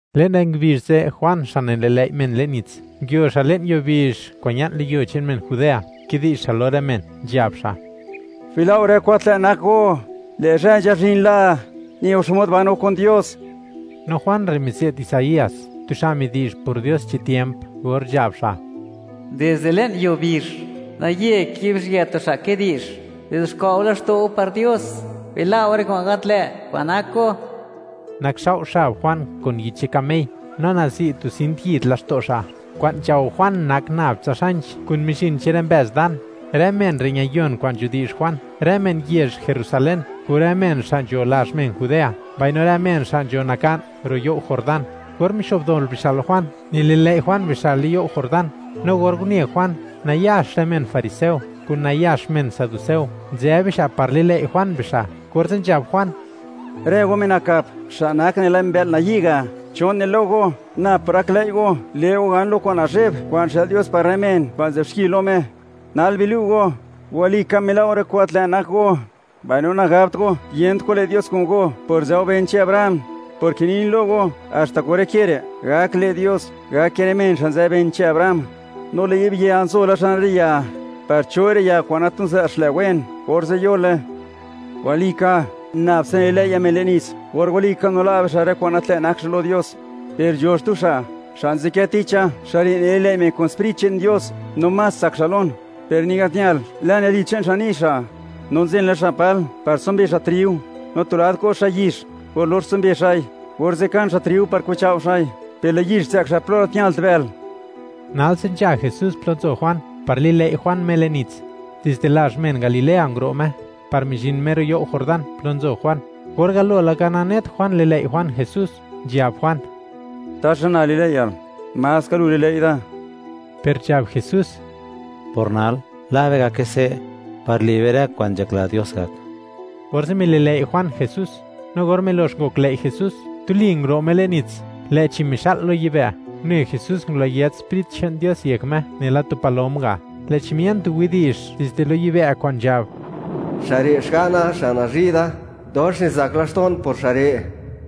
Le'n rë ngubizh ze', Juan xa' nililëi' men le'n nits, nguio xa' le'n yuo bizh kwa'n ña'n lo yuo che'n men Judea, kidi'zh xa' lo rë men, nzhab xa': ―Bila' go rë kwa'n gat lë' nak go; lë' zhë nzhazhin la, ne go xmod ban go kun Dios. No Juan re' mize't Isaías, tu xa' midi'zh por Dios chi tiemp or nzhab xa': Dizde le'n yuo bizh, naye kibizhyë tu xa', kidi'zh: “Bizuxkwa' go laxto' go par Dios; bila' go rë kwa'n gat lë' kwa'n nak go.” Nakxao' xab Juan kun yich che'n kamey, no nazi' tu sint yid laxto' xa'; kwa'n nzhao Juan nak nab tsa xanch kun mizhin che'n rë mbëz dan. Rë men re' ñayon kwa'n nidi'zh Juan: rë men yezh Jerusalén kun rë men xa' nzho lazh men Judea, mbaino rë men xa' nzho naka'n ro' you' Jordán. Or nixo'bdol bixa' lo Juan, nili'lëi' Juan bixa' le'n you' Jordán. No or une Juan, nayax rë men fariseo kun nayax men saduceo, nzë bixa' par lilëi' Juan bixa', orze' nzhab Juan: ―¡Rë go, men nakap, xa' nak nela mbë'l nayi' ga'! ¿Cho ne lo go, nab por gaklëi' go, le' go gan lo kwa'n nazhe'b kwa'n xë'l Dios par rë men kwa'n nzë'b xki lo Me? Nal bilu' go, walika mila' go rë kwa'n gat lë' nak go, mbaino nagabt go, yent kwa'n le' Dios kun go por nzë go ben che'n Abraham, porke nin lo go, haxta kun rë ke re', gak le' Dios, gake rë men xa' nzë ben che'n Abraham, no lë' yi'b ya nzo la xan rë ya, par cho'i rë ya kwa'n gat niza' xlë wen, orze' yole. Walika, nab tsa nililë̱i'ña̱ men le'n nits or walika nila' bixa' rë kwa'n gat lë' nak bixa' lo Dios. Per nzho xtu xa', xa' nzadkë ticha, xa' re' nililëi' men kun Sprit che'n Dios, no más tsak xa' lon. Per ni gat ñal lan yalyid che'n xa' ni' xa'. No nzen la xa' pal par tsumbe xa' triu, no tu lad ko' xa' yix. Or lox tsumbe xa'i, orze' kan xa' triu par kichao' xa'i, per lë' yix zë'k xa' plo gat ñalt bël. Nalse nzha Jesús plo nzo Juan par lilëi' Juan Me le'n nits; dizde lazh men Galilea nguro' Me par mizhin Me ro' you' Jordán plo nzo Juan. Or galo laka nanet Juan lilëi' Juan Jesús, nzhab Juan: ―¿Taxa na lilë̱i̱ña̱l? ¡Maska lu lilëi' da! Per nzhab Jesús: ―Por nal, la' be gake se', par le' be rë kwa'n nzhakla Dios gak. Orze' mililëi' Juan Jesús. No or milox ngoklëi' Jesús, tuli nguro' Me le'n nits, lë'chi mixa'l lo yibë', une Jesús ngulayët Sprit che'n Dios yek Me, nela tu palom ga', lë'chi mien tu widi'zh dizde lo yibë' kwa'n nzhab: ―Xa' re' Xga'na xa' nazhi' da; dox nizak laxto'n por xa' re'.